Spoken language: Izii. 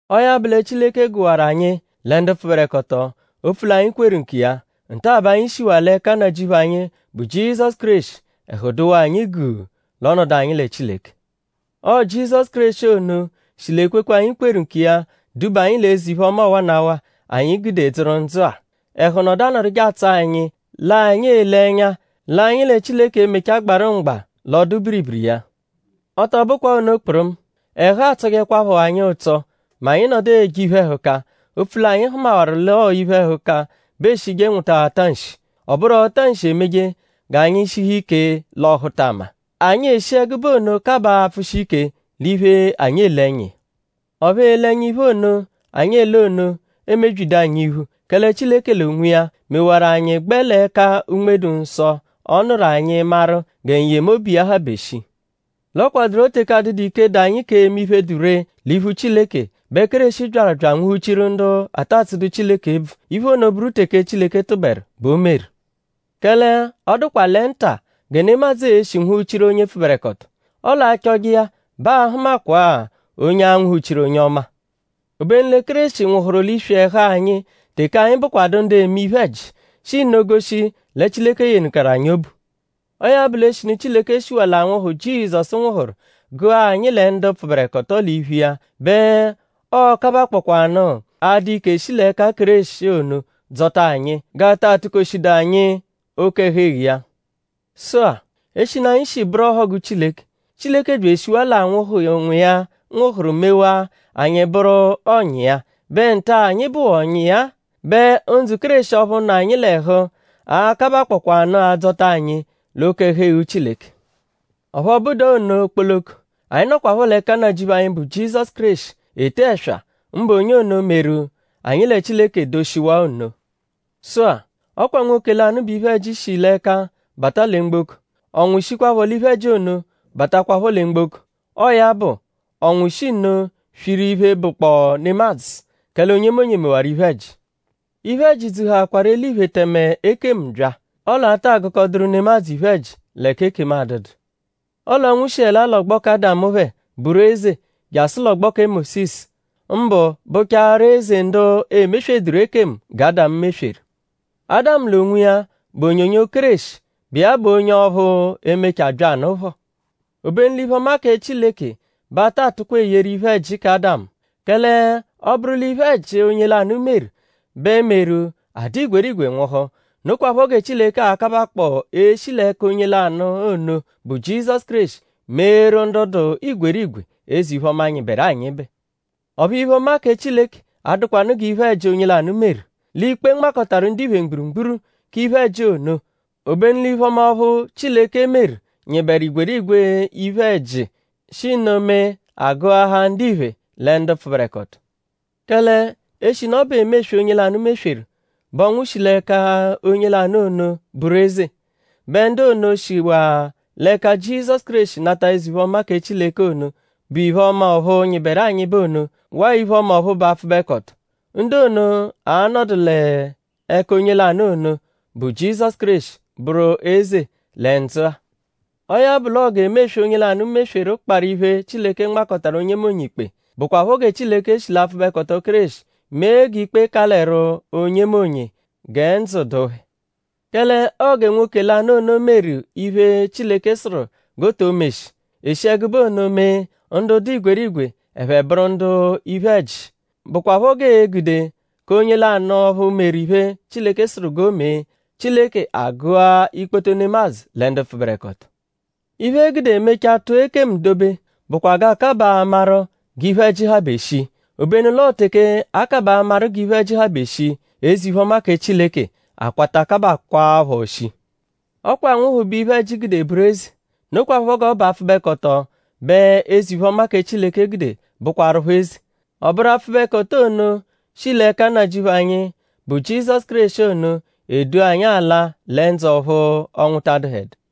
Ọo ya bụ lẹ Chileke gụwaru anyi lẹ ndu pfụberekoto opfu l'anyi kweru nkiya. Nta-a bẹ anyi shiwaa l'ẹka Nnajịuphu anyi, bụ Jizọsu Kéreshi; ẹhu dụwaa anyi guu l'ọnodu anyi lẹ Chileke. Ọo Jizọsu Kéreshi ono shi l'ekwekwe, anyi kweru nkiya duba anyi l'eze-iphe-ọma ọwanawa, anyi gude dzụru ndzụ-a. Ẹhu nọdu anọduje atsọ anyi l'anyi ele ẹnya l'anyi lẹ Chileke e-mechaa gbarụ mgba l'ọdu-biribiri iya. Ọ tọ bụkwaa ono kpụrumu; ẹhu atsọjekwapho anyi ụtso mẹ anyi nọdu eje iphe-ẹhuka; opfu l'anyi hụmawaru l'ọo l'iphe-ẹhuka bẹ eeshije nwụta ata nshi. Ọ bụru ọta-nshi emeje g'anyi shihu ike l'ọhutama. Anyi eshi ẹgube ono kabaa apfụshi ike l'iphe, anyi ele ẹnya iya. Ọphu ele ẹnya iphe ono, anyi ele ono emebyidu anyi iphu; kẹle Chileke l'onwiya mewaru anyi gbẹ l'ẹka Unme-dụ-Nsọ, ọ nụru anyi maru gẹ n-yemobu iya habe shii. L'ọ kwadụro teke adụdu ike, dụ anyi k'eme iphe, dụ ree l'iphu Chileke bẹ Kéreshi byaru bya anwụhu-chiru ndu ata tsụdu Chileke ebvu. Iphe ono bụru teke Chileke tụberu bẹ o meru. Kẹle ọ dụkwa lẹ ńtà gẹ nemadzụ e-shi nwụhu-chiru onye pfụberekoto. Ọle a -chọje iya bẹ aa-hụmakwaa onye a-nwụhu-chiru onye ọma. Obenu lẹ Kéreshi nwụhuru l'iswi ẹhu anyi teke anyi bụkwadu ndu eme iphe-ẹji; shi nno goshi lẹ Chileke yenụkaru anyi obu. Ọo ya bụ l'eshinu Chileke shiwaa l'anwụhu, Jizọsu nwụhuru; gụa anyi lẹ ndu pfụberekoto l'iphu iya bẹ ọo-kabakpọkwanu adụ ike shi l'ẹka Kéreshi ono dzọta anyi; g'a taa tụ-koshidu anyi oke-ẹhu-eghu iya. Sụ-a; eshinu anyi shi bụru ọhogu Chileke; Chileke bya eshiwaa l'anwụhu, Nwa iya nwụhuru mewaa anyi bụru ọ̀nyà iya; bẹ nta-a, anyi bụwaa ọ̀nyà iya-a bẹ ndzụ Kéreshi ọphu nọ anyi l'ẹhu a-kabakpọkwaanu adzọta anyi l'oke-ẹhu-eghu Chileke. Ọphu ọ bụdua ono kpoloko; anyi nọkwapho l'ẹka Nnajịuphu anyi, bụ Jizọsu Kéreshi ete ẹswa; mbụ onye ono, meru anyi lẹ Chileke doshiwaa ono. Sụ-a; ọ kwa nwoke lanụ bẹ iphe-ẹji shi l'ẹka bata lẹ mgboko. Ọnwu shikwaphọ l'iphe-ẹji ono batakwaphọ lẹ mgboko. Ọo ya bụ; ọnwu shi nno swiru iphe, bụkpoo nemadzụ; kẹle onyemonye mewaru iphe-ẹji. Iphe-ẹji dzuhaakwaru eliphe tẹme ekemu bya. Ọle a ta gụkoduru nemadzụ iphe-ẹji l'ẹka ekemu adụdu. Ọle ọnwu shiẹlaa l'ọgbo kẹ Ádamu phẹ bụru eze jasụ l'ọgbo kẹ Mósisu; mbụ bụchaaru eze ndu emesweduru ekemu gẹ Ádamu mesweru. Ádamu l'onwiya bụ onyonyo Kéreshi, bụ iya bụ onye ọphu, e-mechaa byanụ phọ. Obenu l'iphe-ọma kẹ Chileke bẹ a ta tụkwa eyeru iphe-ẹji kẹ Ádamu. Kẹle ọ -bụru l'iphe-ẹji, onye lanụ meru; bẹ meru a dụ igwerigwe nwụhu; nokwaphọ gẹ Chileke a-kabakpọo eshi l'ẹka onye lanụ ono, bụ Jizọsu Kéreshi meeru ndu dụ igwerigwe eze-iphe-ọma, nyịberu anyịbe. Ọphu iphe-ọma kẹ Chileke adụkwanu gẹ iphe-ẹji, onye lanụ meru. L'ikpe, nmakọtaru ndiphe mgburugburu k'iphe-ẹji ono. Obenu l'iphe-ọma ọphu Chileke meru nyịberu igwerigwe iphe-ẹji; shi nno mee agụhaa ndiphe lẹ ndu pfụberekoto. Kẹle eshinu ọ bụ emeswe, onye lanụ mesweru bẹ ọnwu shi l'ẹka onye lanụ ono bụru eze; bẹ ndu ono, shiwaa l'ẹka Jizọsu Kéreshi nata eze-iphe-ọma kẹ Chileke ono, bụ iphe-ọma ọphu nyịberu anyịbe ono; waa iphe-ọma ọphu bụ apfụbekoto; ndu ono a-nọdu l'ẹka onye lanụ ono, bụ Jizọsu Kéreshi bụru eze lẹ ndzụ-a. Ọo ya bụ l'ọo g'emeswe, onye lanụ mesweru kparụ iphe, Chileke nmakọtaru onyemonye ikpe; bụkwapho gẹ Chileke shi l'apfụbekoto Kéreshi mee g'ikpe kalẹru onyemonye gẹ ndzụ dụ phẹ. Kẹle ọo gẹ nwoke lanụ ono meru iphe, Chileke sụru g'o to meshi; e shi ẹgube ono mee ndu dụ igwerigwe ẹphe bụru ndu iphe-ẹji; bụkwapho g'ee-gude k'onye lanụ ọphu meru iphe, Chileke sụru g'o mee; Chileke agụa ikpoto nemadzụ lẹ ndu pfụberekoto. Iphe, e gude e mechaa tụa ekemu dobe bụkwa g'a kabaa amaru g'iphe-ẹji habe shii. Obenu l'ọo teke a kabaa amaru g'iphe-ẹji habe shii; eze-iphe-ọma kẹ Chileke akwata kabakwaaphọ shii. Ọ kwa anwụhu bẹ iphe-ẹji gude bụru eze. Nokwaphọ g'ọ bụ apfụbekoto bẹ eze-iphe-ọma kẹ Chileke gude bụkwarupho eze. Ọ bụru apfụbekoto ono, shi l'ẹka Nnajịuphu anyi, bụ Jizọsu Kéreshi ono edu anyi ala lẹ ndzụ ọphu ọnwu ta adụhedu.